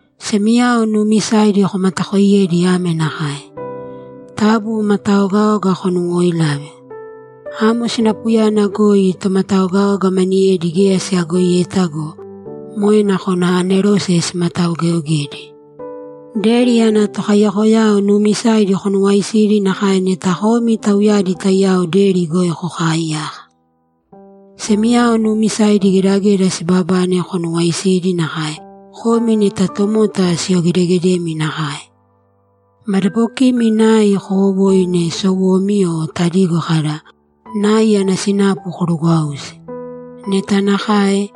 Semiyao nuumisaidi komatakooiyēdi ame nakae: Taabu mataogaoga konuwooilāve. Amo sinapuyana goi tomataogaoga maniyedi geya siyagoiyeta go, moe nakona anerose simataogeogedi. Deri ana tokaiyakoyao nuumisaidi konuwaaisīdi nakae neta komi tauyadi taiyao deri goi kokaaiyaka. Semiyao nuumisaidi gedageda siibabane konuwaaisīdi nakae komi neta tomota siyogedegedemi nakae. Madabokimi nai kowowōine sowomi o tadigo kada, ‘Nai ana sinapu korugwāusi.’ Neta nakae,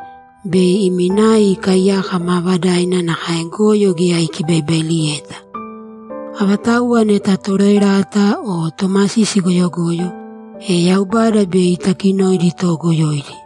bei imi nai ikaaiyaka maavadaina nakae goyo geya ikibaibailiyeta. Avatauwa neta toroerata o tomasisi goyogoyo, e Yaubada bei itakinoidi toogoyoidi.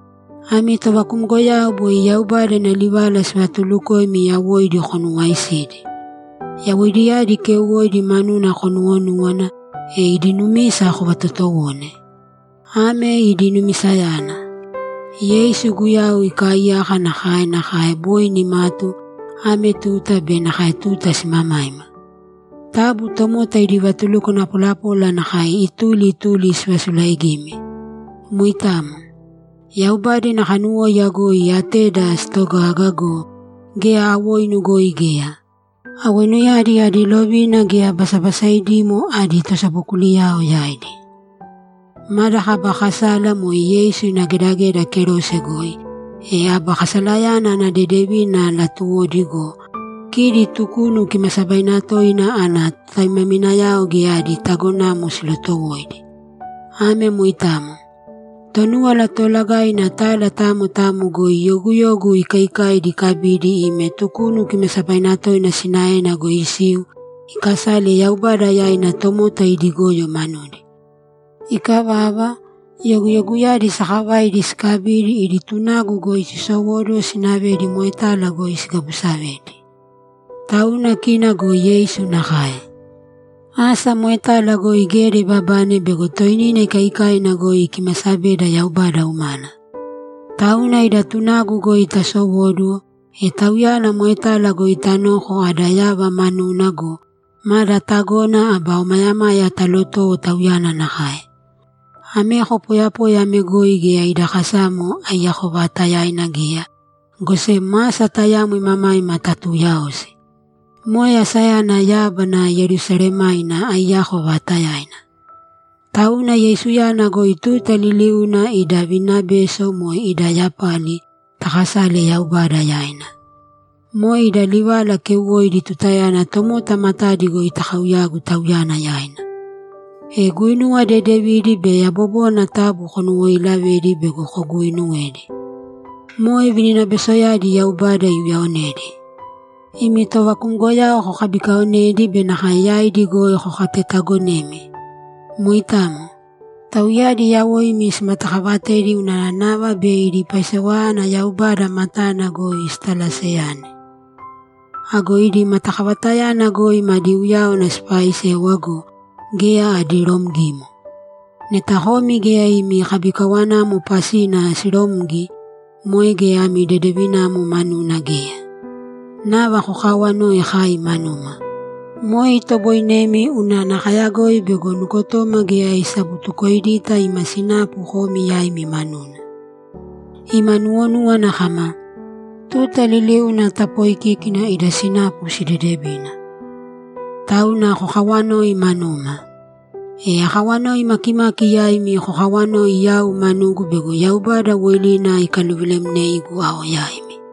Ami tovakumgoyao boi Yaubada ina livala sivatuulukoimi yawoidi konuwaaisīdi. Yawoidiyadi keuwoidi manuna konuwonūwana, e idi numisa kovatotowōne. Ame idi numisayana: Yeisu Guyau ikaaiyaka nakae nakae boi nimatu, ame tuta be nakae tuta simamaima. Taabu tomota idi vatulukwana polapola nakae ituli ituli sivasulaaigīmi. Moitamo. Yaubada ina kanuwóiya goi ateda sitogaga go, geya awoinu goi geya. Awoinuyadi adi lovina geya basabasaidimo adi tosabokuliyao yaidi. Mada kaba kasala moe Yeisu ina gedageda kerose goi, e aba kasalayana ana dedevina talotowoidi go, kidi Tukunu Kimaasabaina Toina ana totaimaminayao geya adi tagonamo silotowoidi. Ame moitamo. Tonúwala Toolagaina tala tamo tamo goi yoguyogu ikaikaidi ikabidi ime Tukunu Kimaasabaina Toina sinaena goi isiu ikasale Yaubada yaina tomota idi goyo manudi. Ikavava, yoguyoguyadi sakavaidi sikabidi idi tunagu goi sisowóduwo sinavedi moetala goi sigabusavedi. Tauna kina go Yeisu nakae. Asa moetala goi geda ibabane bego toinina ikaikaina goi ikimasabeda Yaubada umana. Tauna ida tunagu goi tasowōduwo, e Tauyana moetala goi tanōko ada yava manuna go, mada tagona aba omayamaya talotōwo Tauyana nakae. Ameko poyapoya ame goi geya ida kasamo aiyako vaatayaina geya, go sem asa tayamo imamaima tatuuyaosi. Moe asayana yábana Yerusalemaina aiyako vaatayaina. Tauna Yeisuyana goi tuta liliuna ida vininabeso, moe ida yapali, takasāle Yaubada yaina. Moe ida livala keuwoidi tutayana tomota matadi goi takauyagu Tauyana yaina. E guinuwa dedevidi be yabobona taabu konuwooilavēdi bego koguuinuwedi. Moe vininabesoyadi Yaubada iuyaonedi. Imi tovakumgoyao kokabikaonēdi be nakae yaidi goi kokatetaagonēmi. Moitamo. Tauyadi yawoimi simatakaavatedi unana nava bei idi paisewayana Yaubada matana goi sitalaseyane. Ago idi matakavatayana goi madi uyáwana sipaisēwa go, geya adi romgimo. Neta komi geya imi kabikawanamo pasina siromgi, moe geya ami dedevinamo manuna geya. Nava kokaawanōi kai manuma. Moe itoboinemi unana kayagoi bego nukotoma geya isabutukoidita ima sinapu komi yaimi manuna. Ima nuwonúwana kama, ‘Tuta liliuna tapoikíkina ida sinapu sidedevina.’ Tauna kokawanōi manuma. E akawanoi makimaki yaimi kokawanōi yau manugu bego Yaubada woilina ikaluvilemneigu ao yaimi.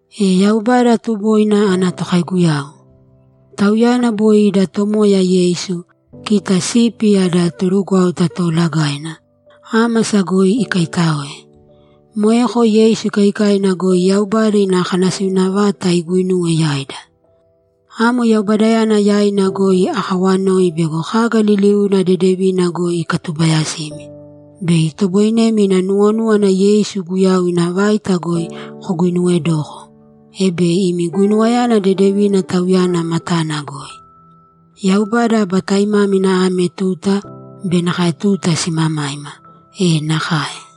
E Yaubada tuboina ana tokaiguyau. Tauyana boi ida Tomoya Yeisu, kita sipi ada torugwáuta toolagaina, ámasa goi ikaitáoe. Moeko Yeisu ikaikaina goi Yaubada ina kanasiuna vata iguinuwe yaida. Amo Yaubadayana yaina goi akawanoi bego kaga liliuna dedevina goi ikatubayasimi, bei itoboinemi ina nuwonúwana Yeisu Guyau ina vaita goi koguinuwedoko, e bei imi guinuwayana dedevina Tauyana matana goi. Yaubada aba taimámina ame tuta be nakae tuta simamaima! E nakae!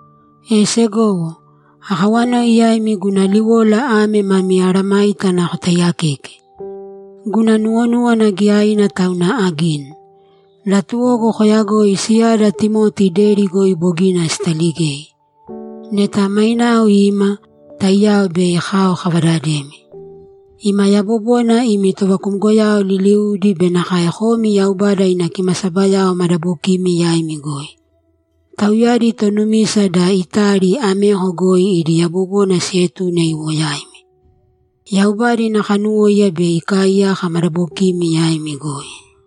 E segowo, akawanoi yaimi guna liwola ame mami mesayágana kotaiyakēke. Guna nuwonúwana giyaina tauna agini. Latuwogu koyagoi siyada Timoti deri goi bogina sitaligei. Neta mainao ima, taiyao bei kao kavadademi. Ima yabobona imi tovakumgoyao liliudi be nakae komi Yaubada ina kimasabayao madabokimi yaimi goi. Tauyadi tonumisa da Itali ameko goi idi yabobona sietune iwo yaimi. Yaubada ina kanuwóiya bei ikaaiyaka madabokimi yaimi goi!